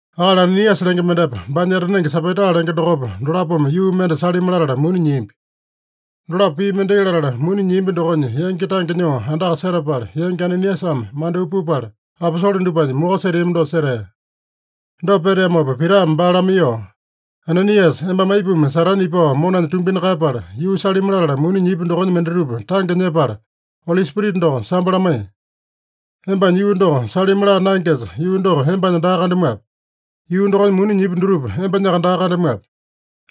Akali Ananiasa lenge mendepa, baanya etanenge Sapaita lenge dokopa, dolapome yuu mende salimi latala muni nyiambi. Dolapo pii mendai latala, muni nyiambi dokonya yangi tange nyoo andaka setapala, yangi Ananiasame mandyoo pupala, aposole dupanya moko seteami dosa setea. Dopa peteamopa Pitame baa lamaiyoo, “Ananiasa, embame aipuma Satane ipao monanya tumbina kaeyapala, yuu salimi latala muni nyipi dokonya mendatupa tange nyepala, Oli Spirita doko sambo lamaiye? Embanya yuu doko salimi laa naengesa, yuu doko embanya daa kandamuape? Yuu dokonya muni nyipi dutupa, embanyaka daa kandamuape?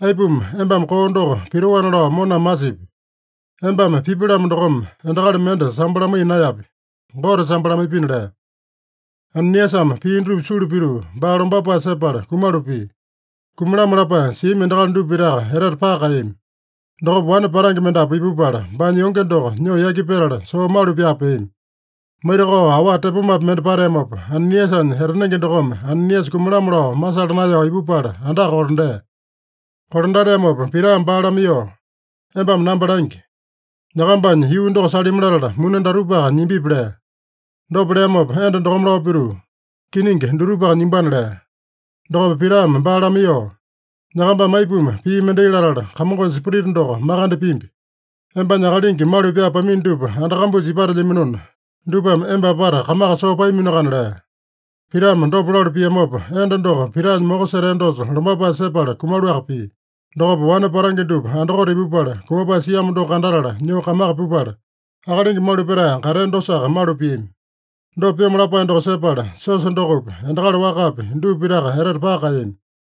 Aipuma embame koo doko pitoana lao moname masipi? Embame pipi-lamo dokome, endakali mende sambo lamaiya naeyapi. Gote sambo lamaipina” lea. Ananiasame pii dutupa sulu pituu, baa lombapae sepala kumalu pia. Kumalamo lapae siami endakali dupa pitaka etete paka kaeyami. Dokopa wane patange mendapu ipupala, baanya yonge doko nyoo yaki petala, soo malu pyaa peami. Maitakao, awa tepomapi mende pateamopa, Ananiasanya etanenge dokome Ananiasa kumalamo lao masala naeyao ipupala andaka kolandea. Kolandateamopa Pitame baa lamaiyoo, “Embame namba langi. Nyakambanya yuu doko salimi latala muni datupaka nyimbipi?” lea. Dopa leamopa enda dokome lao pituu, “Kiningi, dutupaka nyimbana” lea. Dokopa Pitame baa lamaiyoo, “Nyakambame aipuma pii mendai latala, Kamongonya Spirita doko makande pimbi? Embanya akalingi malu pyaa pamino dupa anda kambusa ipatelyaminona, dupame emba apata kamaka soo paaminoakana” lea. Pitame dopa lalu piamopa, enda doko Pitanya moko setea dosa lombapae sepala kumaluaka pia. Dokopa wane patange dupa andakote ipupala, kumapae siamo doko kandatala, nyoo kamaka pupala, akalingi malu petae katea dosaka malu piami. Dopa pyomo lapae doko sepala, siosa dokopi, endakali wakapi, dupa pitaka etete paka kaeyami.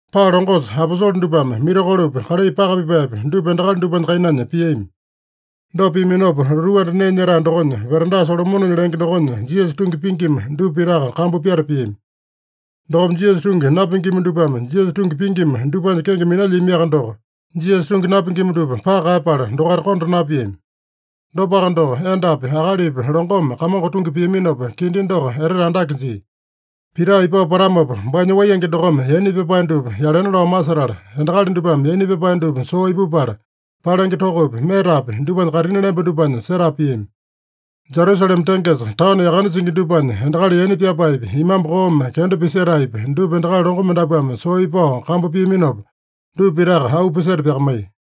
Paa longosa aposole dupame mirakolopi, kalai paka pipaepi, dupa endakali dupanya kainanya piami. Dopa piaminopa, lotuu anda nee nyetae dokonya, veranda Solomonenya lenge dokonya Jisasa tungi pingima dupa pitaka kambu pyata piami. Dokopa Jisasa tungi napingima dupame Jisasa tungi pingima dupanya kenge minalyiamiaka doko, Jisasa tungi napingima dupa paka kaeyapala, dokaita konda napiami. Dopaka doko, endapi, akalipi longome Kamongo tungi piaminopa, kindi doko etete andake jia. Pita ipao patamopa baanya waiyenge dokome yaina pyapae dupa yalena lao masetala, endakali dupame yaina pyapae dupa soo ipupala, palenge tokopi, metapi dupanya kaitini lemba dupanya setapa piami. Jerusalema tengesa taono yakane singi dupanya, endakali yaina pyapaepi, imambu koome kenda pisetaepi, dupa endakali longo mendapuame soo ipao kambu piaminopa, dupa pitaka auu piseta pyakamaiya.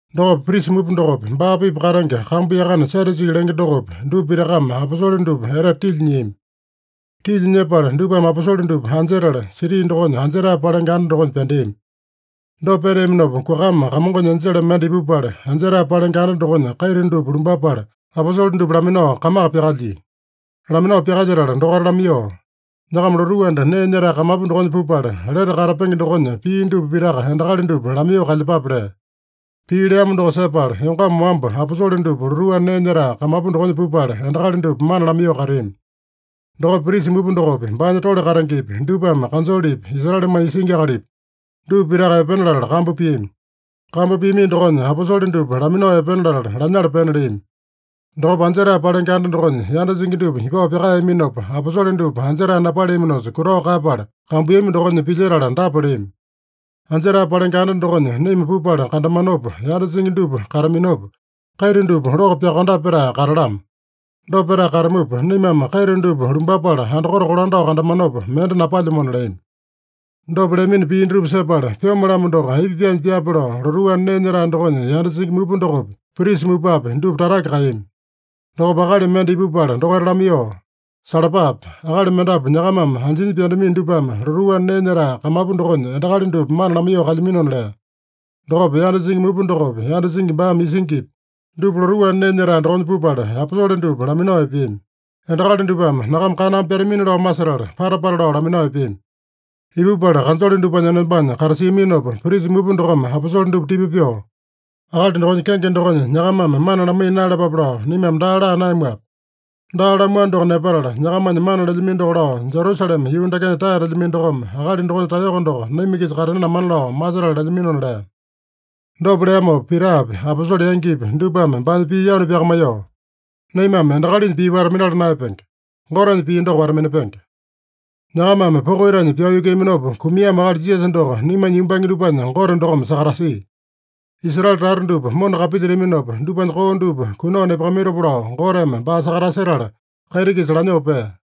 Dokopa prisa mupa dokopi, baa-pipa katenge kambu yakane Sadyusi lenge dokopi, dupa pitakame aposole dupa etete tilya nyiami. Tilya nyepala dupame aposole dupa anjetala, siti dokonya anjetae palenge anda dokonya pyandeami. Dopa peteaminopa, kuakama Kamongonya enjele mende ipupala, anjetae palenge anda dokonya kaita dupa lumbapala, aposole dupa laminao kamaka pyakalyia. Laminao pyakalyetala dokaita lamaiyoo, “Nyakama lotuu anda nee nyetae kamapu dokonya pupala, lete katapenge dokonya pii dupa pitaka endakali dupa lamaiyoo kalyepape” lea. Pii leamo doko sepala, yongama wamba aposole dupa lotuu anda nee nyetae kamapu dokonya pupala, endakali dupa mana lamaiyoo kateami. Dokopa prisa mupa dokopi, baanya tole katengepi, dupame kanjolepi, Israelemanya isingi akalipi, dupa pitaka epena latala kambu piami. Kambu piamino dokonya aposole dupa laminao epena latala, lanyala pena leami. Dokopa anjetae palenge anda dokonya yanda singi dupa ipao pyakaeyaminopa, aposole dupa anjetae napaleaminosa, kutao kaeyapala, kambuiyami dokonya pilyetala dapa leami: “Anjetae palenge anda dokonya naima pupala kandamanopa, yanda singi dupa kataminopa, kaita dupa loko pyakondape pyatae katalamo. Dopa petae katamupa, naimame kaita dupa lumbapala andakote kolandao kandamanopa, mende napalyamona” leami. Dopa leamino pii dutupa sepala, pyome-lamo doko aipa pyaanya pyaape lao lotuu anda nee nyetae dokonya yanda singi mupa dokopi, prisa mupapi, dupa tatake kaeyami. Dokopa akali mende ipupala dokaita lamaiyoo, “Salapape! Akali mendapu nyakamame anjinya pyandamino dupame lotuu anda nee nyetae kamapu dokonya endakali dupa mana lamaiyoo kalyaminona” lea. Dokopa, yanda singi mupa dokopi, yanda singi baame isingipi, dupa lotuu anda nee nyetae dokonya pupala aposole dupa laminao epeami. Endakali dupame nyakama kaname pyatamini-lao masetala, pata-pata lao laminao epeami. Ipupala kanjole dupanya enombanya katasiaminopa, prisa mupa dokome aposole dupa tipa pyoo, “Akali dokonya kenge dokonya nyakamame mana lamaiya naeyalapape lao naimame daa laa naeyamuape? Daa lamuano doko nepatala, nyakamanya mana lelyamino doko lao, Jerusalema yuu dakenya taeyatalamino dokome, akali dokonya taeyoko doko naima-kisa katena lamana lao masetala lelyaminona” lea. Dopa leamopa Pitapi, aposole yangipi dupame baanya pii yanu pyakamaiyoo, “Naimame endakalinya pii wata-minala naeyapenge. Gotenya pii doko wata-minapenge. Nyakamame poko itanya pyao yukuiyaminopa kumiamo akali Jisasa doko naimanya yumbange dupanya Gote dokome sakatasia. Israele tata dupa mona kapilyetaminopa, dupanya koo dupa kunao nepakamaitopa lao Goteme baa sakatasetala, kaiti-kisa lanyoo pea.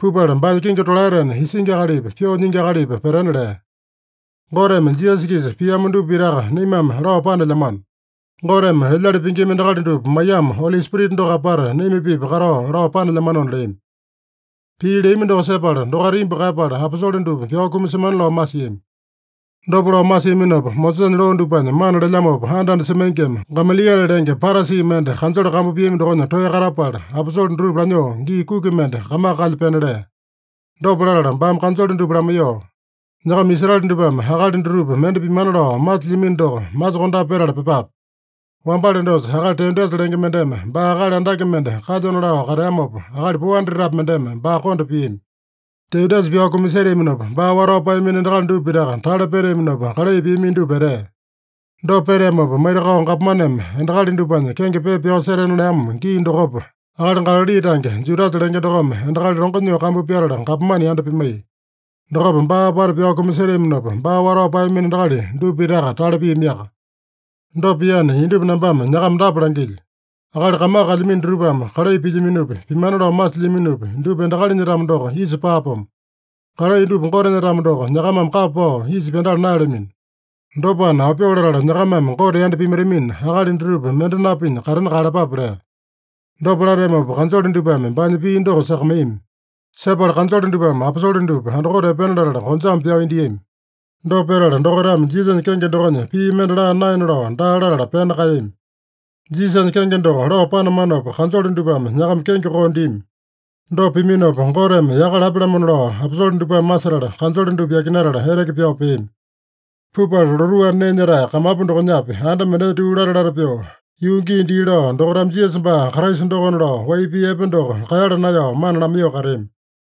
Pupala baanya kingi tolaetena Isingi Akalipa, Pyoo Nyingi Akalipa petena lea. Goteme Jisasa-kisa piamo dupa pitaka naimame lao panelyamano. Goteme lelyali pingima endakali dupa maiyamo, Oli Spirita doko apata naima-pipa katao lao panelyamanona” leami. Pii leami doko sepala dokaita imbu kaeyapala, aposole dupa pyao kumasemana lao masiami. Dopa lao masiaminopa, Mosesanya loo dupanya mana lelyamopa anda-anda semaingima, Gamaliele lenge, Parasi mende kanjole kambu piami dokonya toeya katapala, aposole dutupa lanyoo gii kuki mende kamaka kalya pena lea. Dopa latala baame kanjole dupa lamaiyoo, “Nyakama Israele dupame akali dutupa mende pimana lao masilyamino doko, masokondape petala pyepape. Wambale dosa akali Teudasa lenge mendeme baa akali andake mende kalyona lao kateamopa, akali 400-api mendeme baa konda piami. Teudasa pyao kumaseteaminopa, baa watao paeyamino endakali dupa pitaka tale peteaminopa, kalai piamino dupa etea. Dopa peteamopa, maitakao gapomaneme endakali dupanya kenge pepa pyao setena leamo gii dokopa, akali Galali tange Judasa lenge dokome endakali longo nyoo kambu pyatala, gapomane yanda pimaiya. Dokopa baa apata pyao kumaseteaminopa, baa watao paeyamino endakali dupa pitaka tale piamiaka. Dopa piana, indupa nambame nyakama dapa langilyo: Akali kamaka kalyamino dutupame kalai pilyaminopi, pimana lao masilyaminopi, dupa endakalinya-tamo doko, isa paapomo. Kalai dupa Gotenya-tamo doko, nyakamame kapa pao isa pyandala naeyalamino. Dopana, aopyoo latala nyakamame Gote yanda pimaitamina, akali dutupa mende napinya katena kaeyalapape” lea. Dopa lateamopa, kanjole dupame baanya pii doko sakamaiyami. Sepala kanjole dupame aposole dupa andakote epena latala, konjame pyao indiami. Dopa petala, dokaitame Jisasanya kenge dokonya pii mende laa naena lao daa latala, pena kaeyami. Jisasanya kenge doko lao panamanopa, kanjole dupame nyakama kenge koo dimi. Dopa piminopa, Goteme yaka lapya-lamona lao aposole dupame masetala, kanjole dupa yakinatala eteke pyao peami. Pupala lotuu anda nee nyetae kamapu dokonyapi, anda mendenya tuu lata-lata pyoo, yuu gii dii lao dokaitame Jisasa baa Kraisa dokona lao wai pii epe doko kaeyala naeyao mana lamaiyoo kateami.